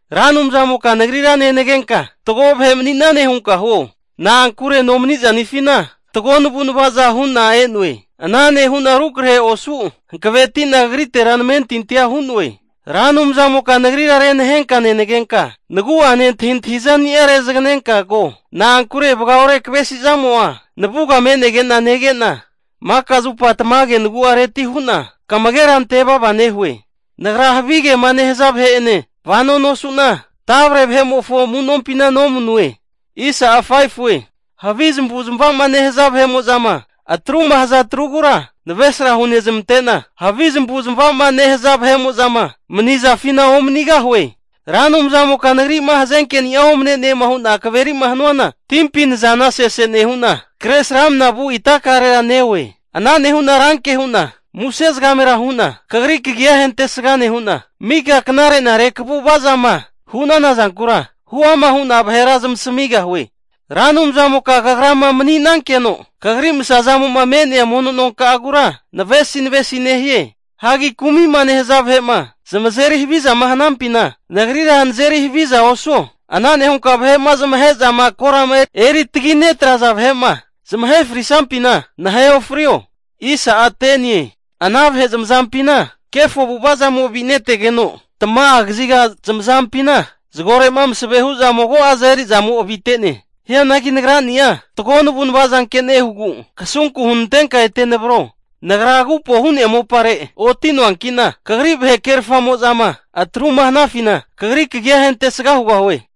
Ra Anumzamoka nagrira nenagenka fatgo vahe mani'nane hunka huo. Na'ankure nomaniza'nifina fatgo navu'nava'za hu'na e'noe. Ana nehu'na rukrahe osu hankaveti'na kagrite namentintia hu'noe. Ra Anumzamoka nagrira renahenka nenagenka, nagu'ane antahintahi zani'a rezaganenka ko. Na'ankure vagaore kavesi zamo'a navuga me'nege'na nege'na, maka zupa tamage nagu'areti hu'na kamagera ante vava nehue. Nagra havigema nehaza vahe'enena vano nosu'na, tavre vahe'mofo amu'nompina nomanue. Havi zamavu zamava'ma nehaza vahe'mo'zama atruma haza atrugura navesra hunezmante'na, havi zamavu zamava'ma nehaza vahe'ma manizafina omanigahue. Ra Anumzamoka nagri'ma hazenkeni'a omane'ne hu'na kaveri'ma hanuana timpi nazana sese nehu'na, Kresramanama vu itakarera neoe. Ana nehu'na ranke hu'na muse zagamera hu'na Kagri kagia ahentesga nehu'na, mika knare'nare kagu'vazama hu'nana zankura, huama hu'na vahera zamasamigahue. Ra Anumzamoka kagrama mani'nankeno, kagri masa zamo'ma me'nea mono nonka'agura navesi navesi nehie. Hagi kumi'ma nehaza vahe'ma zamazeri havizama hanampina, nagrira nazeri haviza osuo. Ana nehunka vahe'ma zamahe'zama korama eri tagi netraza vahe'ma zamahe frisnampina, nahe ofrio. Ana vahe zamazampina kefo avu'avazamo avinetegeno, tamaga kaziga zamazampina zagore'ma masave hu'za mago'aza eri'zamo avite'ne. Hianagi nagrani'a fatgo navu'nava zanke nehugu, kasunku hunantenka ete navro. Nagra agupo hu'nea mopare oti'noanki'na, kagri vahe kerfamo'zama atruma hanafina, kagri kagia ahentesga hugahue.